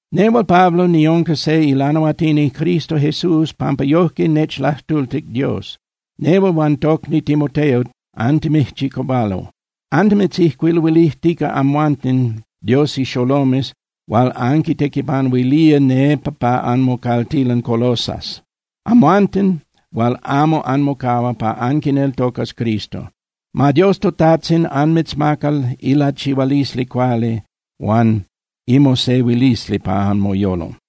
Nehual Pablo niunca se ilanahuatini Cristo Jesús pampa yojque nechlajtultic Dios. Nehual huan tocni Timoteo antimijchicahualo. Annimitzijcuiluilijtica amhuanten Dios ixolomes hual anquitequipanuilía nepa pa anmocaltilan Colosas, amhuanten hual amo anmocahua pa anquineltocas Cristo. Ma Dios toTajtzin anmitzmaca ilachihualisli cuali huan imosehuilisli pa anmoyolo.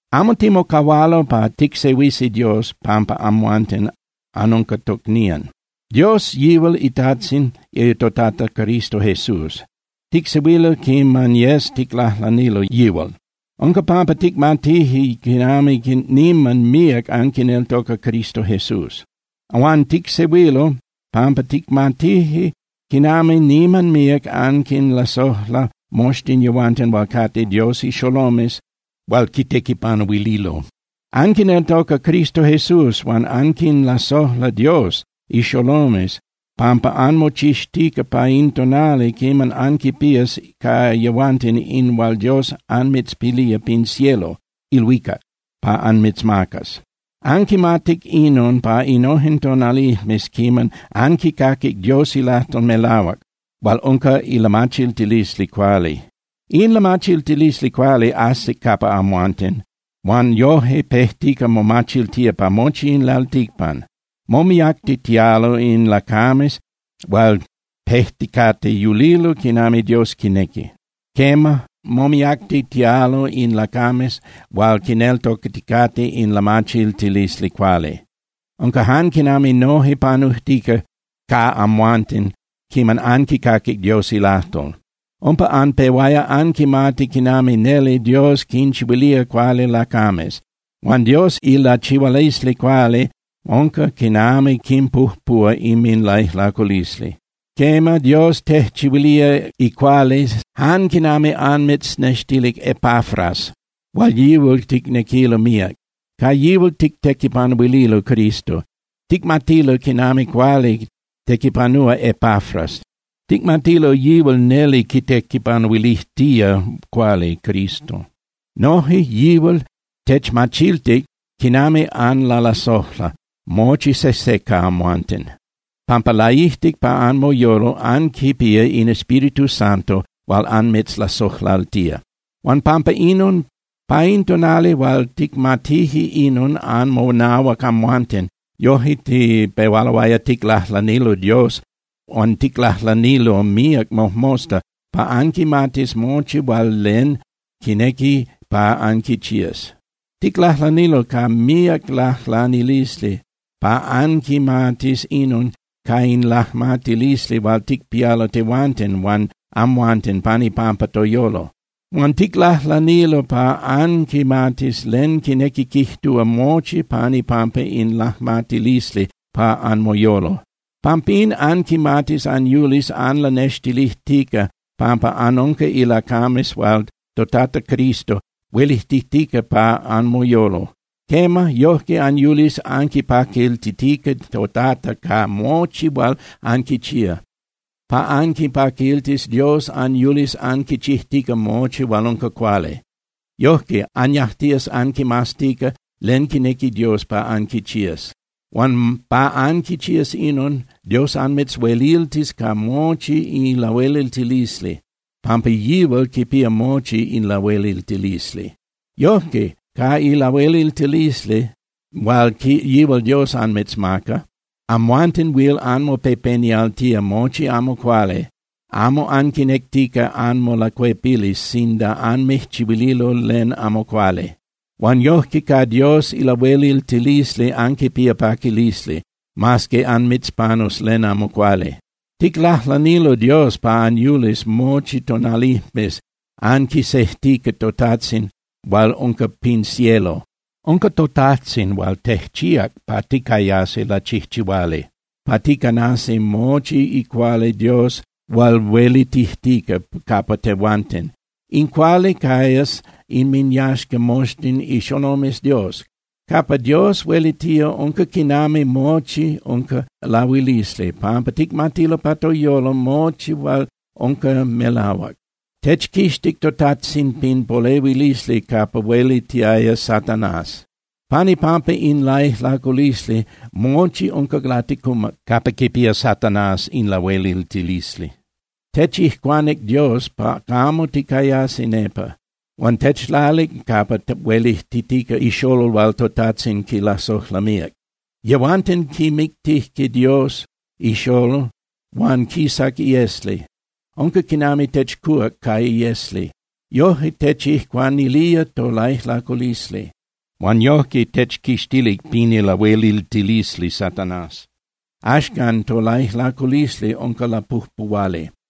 Amo timocahualo pa ticsehuisi Dios pampa amhuanten anunca tocnían. Dios yihual iTajtzin toTata Cristo Jesús. Ticsehuilo quiman yes ticlajlanilo yihual. Unca pampa ticmatije quinami niman míac anquineltoca Cristo Jesús. Huan ticsehuilo pampa ticmatije quinami niman míac anquinlasojla moxtin yehuanten hual cate Dios ixolomes hual quitequipanuililo. Anquineltoca Cristo Jesús huan anquinlasojla Dios ixolomes pampa anmochixtica pa in tonali quiman anquipías ca yehuanten in hual Dios anmitzpilía pin cielo (ilhuicac) pa anmitzmacas. Anquimatic inon pa innojen tonalijmes quiman anquicaquic Dios ilajtol melahuac hual unca ilamachiltilisli cuali. In lamachiltilisli cuali ajsic capa amhuanten, huan yoje pejtica momachiltía pa mochi in lalticpan. Momiactitialo in lacames hual pejticate yulilo quinami Dios quinequi. Quema, momiactitialo in lacames hual quineltocaticate in lamachiltilisli cuali. Unca jan quinami noje panujtica ca amhuanten quiman anquicaquic Dios ilajtol. Umpa anpehuaya anquimati quinami neli Dios quinchihuilía cuali lacames. Huan Dios ilachihualisli cuali unca quinami quinpujpuhua inminlaijlaculisli. Quema, Dios tejchihuilía icuali jan quinami anmitznextilic Epafras hual yihual ticnequilo míac. Ca yihual tictequipanuililo Cristo. Ticmatilo quinami cuali tequipanúa Epafras, ticmatilo yihual neli quitequipanuilijtía cuali Cristo. Noje yihual techmachiltic quinami anlalasojla mochi sejse ca amhuanten, pampa laijtic pa anmoyolo anquipía in Espíritu Santo hual anmitzlasojlaltía. Huan pampa inon, pa in tonali hual ticmatije inon anmonahuac amhuanten, yoje tipehualoaya ticlajlanilo Dios huan ticlajlanilo míac mojmosta pa anquimatis mochi hual len quinequi pa anquichías. Ticlajlanilo ca míac lajlanilisli pa anquimatis inon ca in lajmatilisli hual ticpialo tehuanten huan amhuanten pan ipampa toyolo. Huan ticlajlanilo pa anquimatis len quinequi quijtúa mochi pan ipampa in lajmatilisli pa anmoyolo. Pampín anquimatis anyulis anlanextilijtica pampa anunca lacames hual toTata Cristo huelitijtica pa anmoyolo. Quema, yojque anyulis anquipaquiltitica toTata ca mochi hual anquichía. Pa anquipaquiltis Dios, anyulis anquichijtica mochi hual unca cuali. Yojque anyajtías anquimaztica len quinequi Dios pa anquichías. Huan pa anquichías inon, Dios anmitzhueliltis ca mochi ilahueliltilisli, pampa yihual quipía mochi lahueliltilisli. Yojque ca ilahueliltilisli hual yihual Dios anmitzmaca, amhuanten huil anmopepenialtía mochi amo cuali, amo anquinectica anmolacuepilis sinda anmijchihuililo len amo cuali. Huan yojque ca Dios ilahueliltilisli anquipías paquilisli, mas que anmitzpanus len amo cuali. Ticlajlanilo Dios pa anyulis mochi tonalijmes anquisejtica toTajtzin hual unca pin cielo. Unca toTajtzin hual tejchíac pa ticayasi lachijchihuali pa ticanasi mochi icuali Dios hual huelitijtica capa tehuanten. In cuali cayas inminyaxca mochi ixolomes Dios. Capa Dios huelitía unca quinami mochi unca lahuilisli, pampa ticmatilo pa toyolo mochi hual unca melahuac. Techquixtic toTajtzin pin polehuilisli capa huelitiaya Satanás. Pan ipampa in laijlaculisli, mochi unca laticumac capa quipía Satanás in lahueliltilisli. Techijcuanic Dios pa camo ticayasi nepa, huan techlalic capa huelitijtica iXolol hual toTajtzin quilasojla míac. Yehuanten quimictije Dios iXolol huan quisac iesli. Unca quinami techcuhuac ca iesli. Yoje techijcuanilía tolaijlaculisli, huan yojque techquixtic pin ilahueliltilisli Satanás. Axcan tolaijlaculisli unca lapujpuhuali.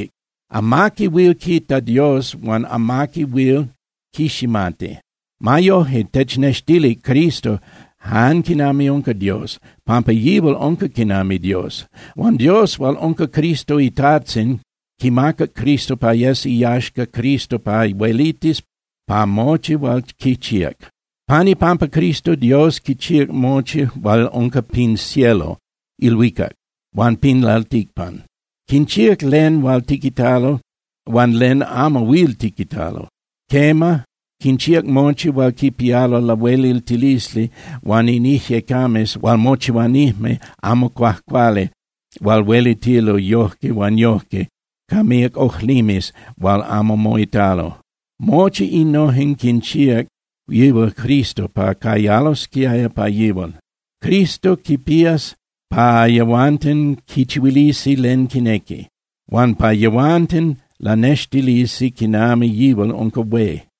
Amaqui huil quita Dios huan amaqui huil quiximati. Ma yoje technextilic Cristo jan quinami unca Dios, pampa yihual unca quinami Dios. Huan Dios hual unca Cristo iTajtzin quimacac Cristo pa yes iyaxca Cristo pa huelitis pa mochi hual quichíac. Pan ipampa Cristo Dios quinchíac mochi hual unca pin cielo (ilhuicac) huan pin lalticpan. Quinchíac len huil tiquitalo huan len amo huil tiquitalo. Quema, quinchíac mochi hual quipialo lahueliltilisli huan in ijyecames hual mochihuanijme amo cuajcuali hual huelitilo yoje huan yoje ca míac ojlimes hual amo moitalo. Mochi innojen quinchíac yihual Cristo pa cayalosquiaya pa yihual. Cristo quinpías pa yehuanten quichihuilisi len quinequi, huan pa yehuanten lanextilisi quinami yihual unca hué.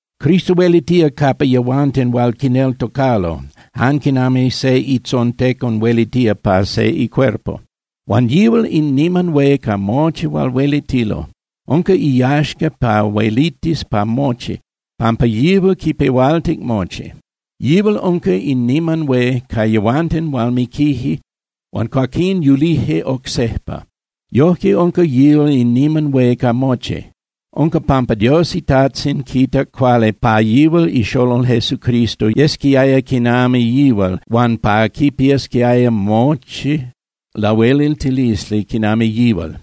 Cristo huelitía capa yehuanten hual quineltocalo, jan quinami se itzontecon huelitía pa se icuerpo. Huan yihual in niman hué ca mochi hual huelitilo. Unca iyaxca pa huelitis pa mochi, pampa yihual quipehualtic mochi. Yihual unca in niman hué ca yehuanten hual miquije huan cuaquín yulije oc sejpa. Yojque unca yihual in niman hué ca mochi. Unca pampa Dios iTajtzin quitac cuali pa yihual iXolol Jesucristo yesquiaya quinami yihual huan pa quipiasquiaya mochi lahueliltilisli quinami yihual.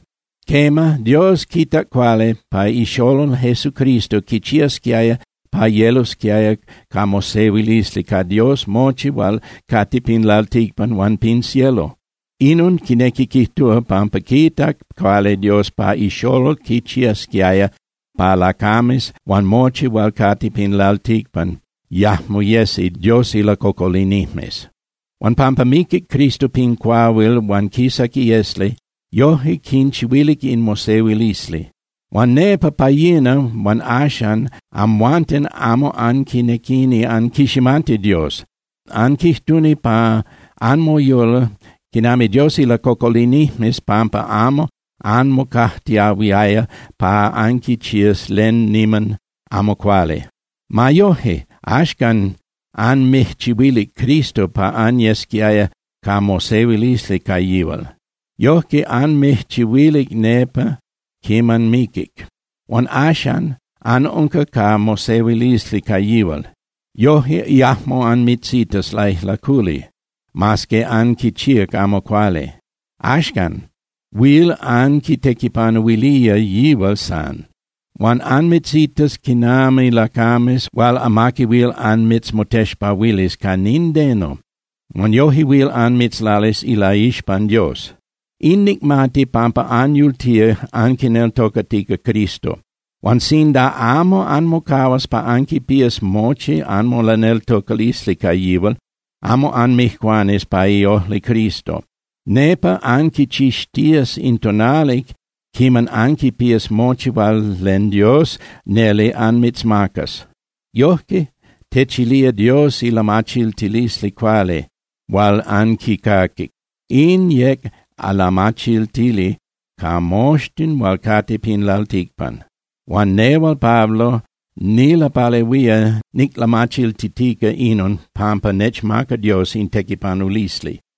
Quema, Dios quitac cuali pa iXolol Jesucristo quichiasquiaya pa yelosquiaya ca mosehuilisli ca Dios mochi hual cate pin lalticpan huan pin cielo. Inon quinequi quijtúa pampa quitac cuali Dios pa iXolol quichiasquiaya pa lacames huan mochi hual cate pin lalticpan yajmo yesi Dios ilacocolinijmes. Huan pampa miquic Cristo pin cuahuil huan quisac iesli, yoje quinchihuilic in mosehuilisli. Huan nepa pa yina huan axan amhuanten amo anquinequini anquiximati Dios. Anquijtuni pa anmoyolo quinami Dios ilacocolinijmes pampa amo anmocajtiahuiaya pa anquichías len niman amo cuali. Ma yoje, axcan anmijchihuilic Cristo pa anyesquiaya ca mosehuilisli ca yihual. Yojque anmijchihuilic nepa quiman miquic. Huan axan anunca ca mosehuilisli ca yihual. Yoje yajmo anmitzitas laijlaculi mas que anquichíac amo cuali. Axan huil anquitequipanuilía yihual san. Huan anmitzitas quinami lacames hual amaqui huil anmitzmotexpahuilis ca nindeno huan yoje huil anmitzlalis ilaixpan Dios. In nicmati pampa anyultía anquineltocatica Cristo. Huan sinda amo anmocahuas pa anquipías mochi anmolaneltocalisli ca yihual, amo anmijcuanis pa iojli Cristo. Nepa anquichixtías in tonali quiman anquipías mochi hual len Dios neli anmitzmacas. Yoje techilía Dios ilamachiltilisli cuali hual anquicaquic. In yec lamachiltili ca moxtin hual cate pin lalticpan. Huan nehual Pablo nilapalehuía niclamachiltitica inon pampa nechmaca Dios in tequipanulisli.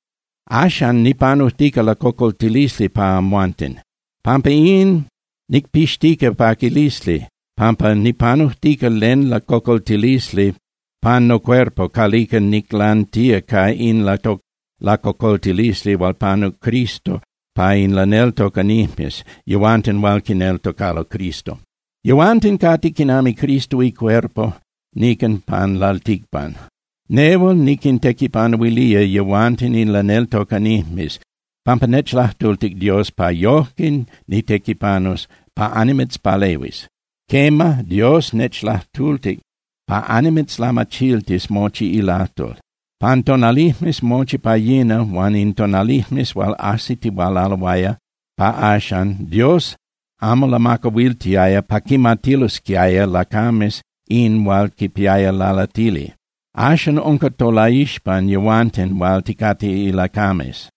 Axan nipanujtica lacocoltilisli pa amhuanten. Pampa in, nicpixtica paquilisli, pampa nipanujtica len lacocoltilisli pan nocuerpo calica niclantía ca in lacocoltilisli hual panuc Cristo pa in laneltocanijmes, yehuanten hual quineltocalo Cristo. Yehuanten cate quinami Cristo icuerpo nican pan lalticpan. Nehual niquintequipanuilía yehuanten in laneltocanijmes pampa nechlajtultic Dios pa yojque nitequipanus pa annimitzpalehuis. Quema, Dios nechlajtultic pa annimitzlamachiltis mochi ilajtol. Pan tonalijmes mochi pa yina huan in tonalijmes hual ajsitihualaloaya pa axan, Dios amo lamacahuiltiaya pa quimatilosquiaya lacames in hual quipiaya lalatili. Axan unca tolaixpan tehuanten hual ticate ilacames.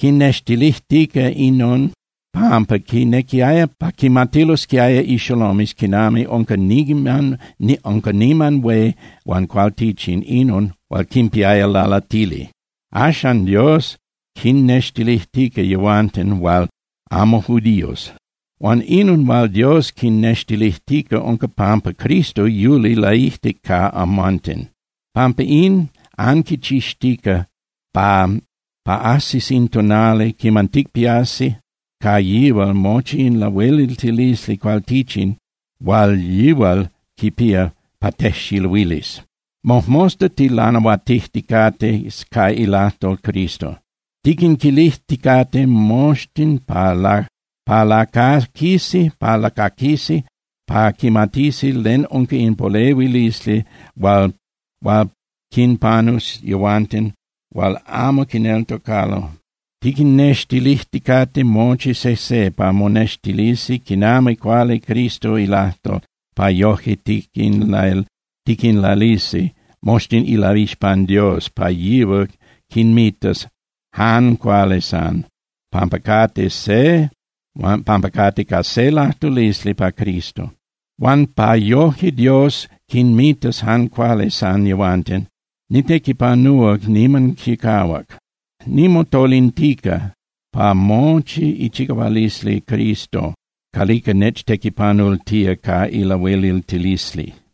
Quinnextilijtica inon pampa quinequiaya pa quimatilosquiaya ixolomes quinami unca niman hué huan cualtichin inon hual quipiaya lalatili. Axan Dios quinextilijtica yehuanten hual amo judíos. Huan inon hual Dios quinnextilijtica unca pampa Cristo yuli laijtic pa amhuanten. Pampa in, anquichixtica pa ajsis in tonali quiman ticpiasi ca yihual mochi in lahueliltilisli cualtichin hual yihual quipía pa tejxiluilis. Mojmosta tilanahuatijticate ca ilajtol Cristo. Tiquinmilijticate moxtin pa lacaquisi pa quimatisi len unca in polehuilisli hual quinpanus yehuanten hual amo quineltocalo. Tiquinnextilijticate mochi sejse pa monextilisi niman cuali Cristo ilajtol, pa yoje tiquinlalisi moxtin ilaixpan Dios pa yihual quinmitas jan cuali san, pampa cate ca se lajtulisli ca Cristo. Huan pa yoje Dios quinmitas jan cuali san yehuanten, nitequipanúa niman chicahuac. Nimotolintica ca mochi ichicahualisli Cristo calica nechtequipanultía ca ilahueliltilisli.